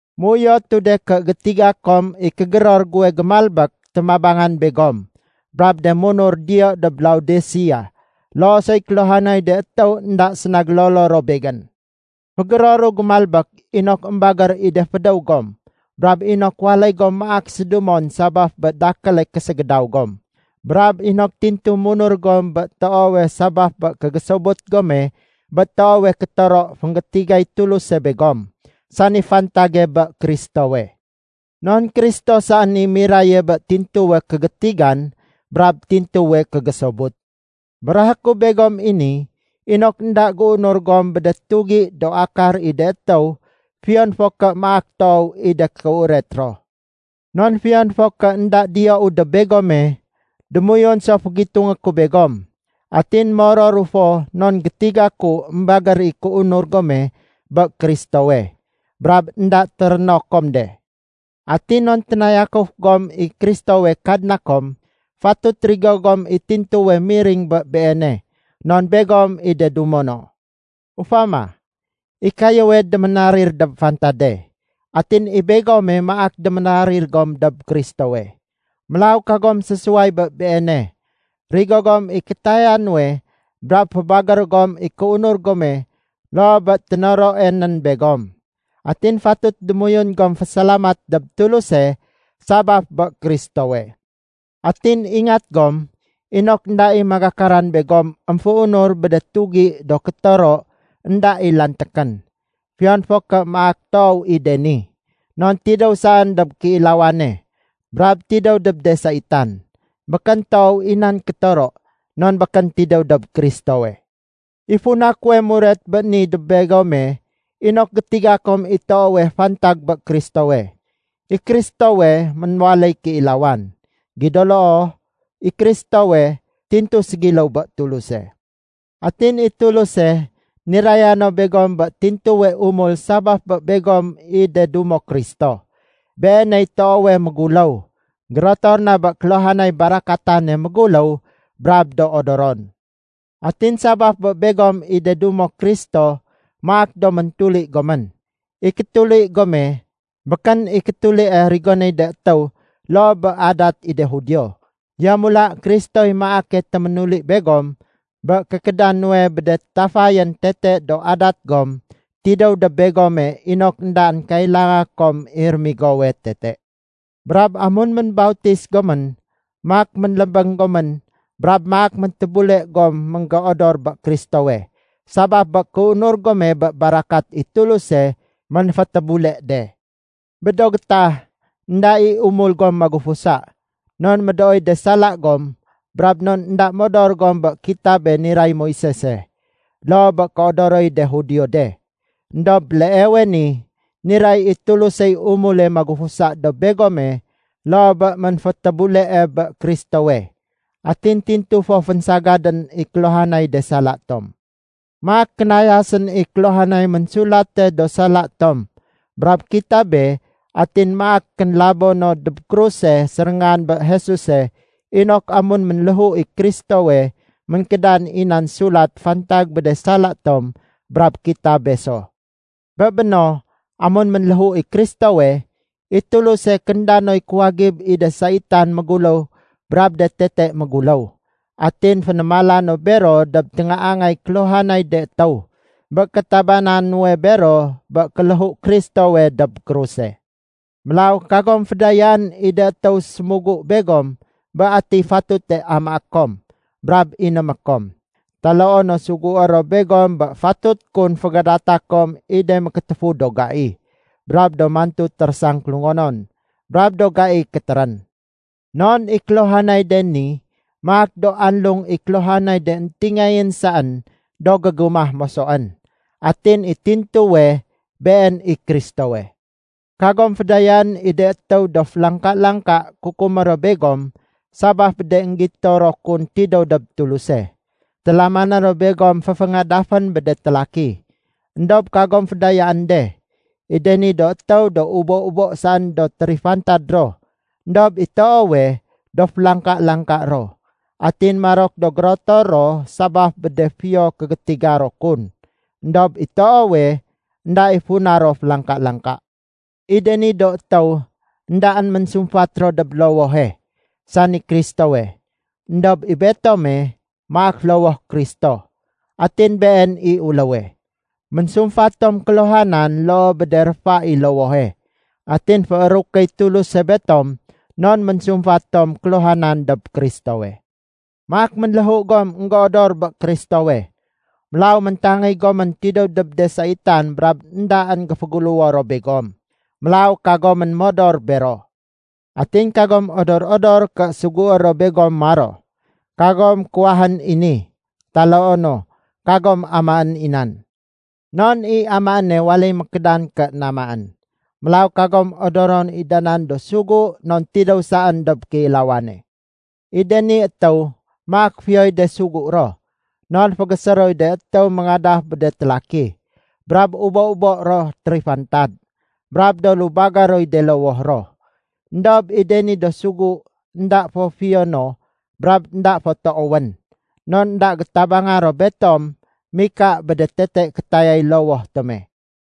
Méuyotu de ké gétiga kom i kégéror guwe gémalbék témabangan begom brab de munur diyo dob Laodisea, loo soy kéluhanay de étéw énda séna gélolo ro begén. Fégéroru gémalbék inok émbagér i de fédéw gom brab inok waléy gom maak sédumon sabaf bé dakéle késégédaw gom, brab inok tintu munur gom bé toowe sabaf bé kégésobut gome bé toowe kétoro fénggétigay Tuluse begom, sani fantage bé Kristowe. Non Kristo saén i miraye bé tintuwe kégétigan brab tintuwe kégésobut. Béréhé ku begom i ni inok énda géunur gom bé de tugi do akar i de étéw fiyon fo ké maak toow i de kéuret ro. Non fiyon fo ké énda diyou dob begome, démoyun so fégitungé ku begom. Atin mororu fo non gétiga ku émbagér i kéunur gome bé Kristowe, brab énda téréno kom de. Atin non ténayakuf gom i Kristowe Kadna kom, fatut rigo gom i tintuwe miring bé Beene non begom i de dumo no. Ufama, i kayéwe déménarir dob fantade. Atin i begome, maak déménarir gom dob Kristowe. Mélaw kagom sésuway bé Beene. Rigo gom i kétaya nuwe brab fébagér gom i kéunur gome loo bé ténoroe nén begom. Atin fatut démoyun gom fésalamat dob Tuluse sabaf bé Kristowe. Atin ingat gom inok énda i magakaran begom émféunur bé de tugi do kétoro énda i lantékén, fiyon fo ké maak toow i de ni. Non tidéw saén dob kéilawane, brab tidéw dob de saitan. Békén toow i nan kétoro non békén tidéw dob Kristowe. I funa kuwe muret bé ni dob begome, inok gétiga kom i toowe fantag bé Kristowe. I Kristowe ménwaléy kéilawan. Gido loo, i Kristowe, tintu ségiléw bé Tuluse. Atin i Tuluse niraya no begom bé tintuwe umul sabaf bé begom i de dumo Kristo. Beeney toowe méguléw, gérotor na bé kéluhanay barakatane méguléw brab do odoron. Atin sabaf bé begom i de dumo Kristo maak do méntuli gomén. I kétuli gome, békén i kétulie rigonéy de étéw loo bé adat i de Judio. Yamula Kristoy maake téménuli begom bé kékéda nuwe bé de tafayén tete do adat gom tidéw dob begome inok éndaén kailanga kom i rémigowe tete. Brab amun ménbautis gomén maak ménlébéng gomén brab maak méntébule gom ménggéodor bé Kristowe, sabaf bé kéunur gome bé barakat i Tuluse ménfétébule de. Bé do gétah énda i umul gom magufusa, non médooy de sala gom brab non énda modor gom bé kitabe niray Moisese, loo bé kéodoroy de Judio de. Endob béleewe ni niray i Tulusey umule magufusa dob begome loo bé ménfétébulee bé Kristowe. Atin tintu fo fénsagadén i kéluhanay de sala tom. Maak kénayasén i kéluhanay ménsulate do sala tom brab kitabe atin maak kénlabo no dob kruso séréngan bé Jesuse inok amun ménléhu i Kristowe ménkédan i nan sulat fantag bé de sala tom brab kitabe so. Bé béno amun ménléhu i Kristowe, i Tuluse kénda noy kuwagib i de saitan méguléw brab de tete méguléw. Atin fénémala no bero dob téngaangay kéluhanay de étéw bé kétabana nuwe bero bé kéléhu Kristowe dob kruse. Mélaw kagom fédayaén i de étéw sémugu begom bé atiy fatute amaé kom brab inémé kom, taloo no sugué ro begom bé fatut kun fégadata kom i de mékétéfu do gai, brab do mantu térésang kélungonon, brab do gai kétérén. Non i kéluhanay de ni maak do anlung i kéluhanay de éntingayén saén do gégumah mosoén, atin i tintuwe, been i Kristowe. Kagom fédayaén i de étéw do félangka-langka kukumé ro begom sabaf bé de énggito ro kun tidéw dob Tuluse. Télamané ro begom féféngadafén bé de télaki. Endob kagom fédayaén de. I de ni do étéw do ubo-ubo saén do térifantad ro, éndob i toowe, do félangka-langka ro. Atin marok do gérotor ro sabaf bé de fiyo kégétiga ro kun, éndob i toowe, énda i funa ro félangka-langka. I de ni do étéw éndaén ménsumfat ro dob lowohe, sani Kristowe. Endob i betome maak lowoh Kristo, atin Been i uléwe. Ménsumfat tom kéluhanan loo bé de réfa i lowohe, atin féérukéy Tuluse betom non ménsumfat tom kéluhanan dob Kristowe. Maak ménléhu gom énggéodor bé Kristowe. Mélaw méntangéy gomén tidéw dob de saitan brab éndaén géféguléwo ro begom. Mélaw kagomén modor bero. Atin kagom odor-odor ké sugué ro begom maro, “Kagom kuwahén i ni”, taloo no, “Kagom amaén i nan”. Non i amaéne waléy mékédan ké namaén. Mélaw kagom odoron i da nan do sugu non tidéw saén dob kéilawane. I de ni étéw maak fiyoy de sugu ro, non fégésé roy de étéw méngadaf bé de télaki, brab ubo-ubo ro térifantad, brab do lubagé roy de lowoh ro. Endob i de ni do sugu énda fo fiyo no brab énda fo toowén. Non énda gétabanga ro betom mika bé de tete kétayay lowoh tome.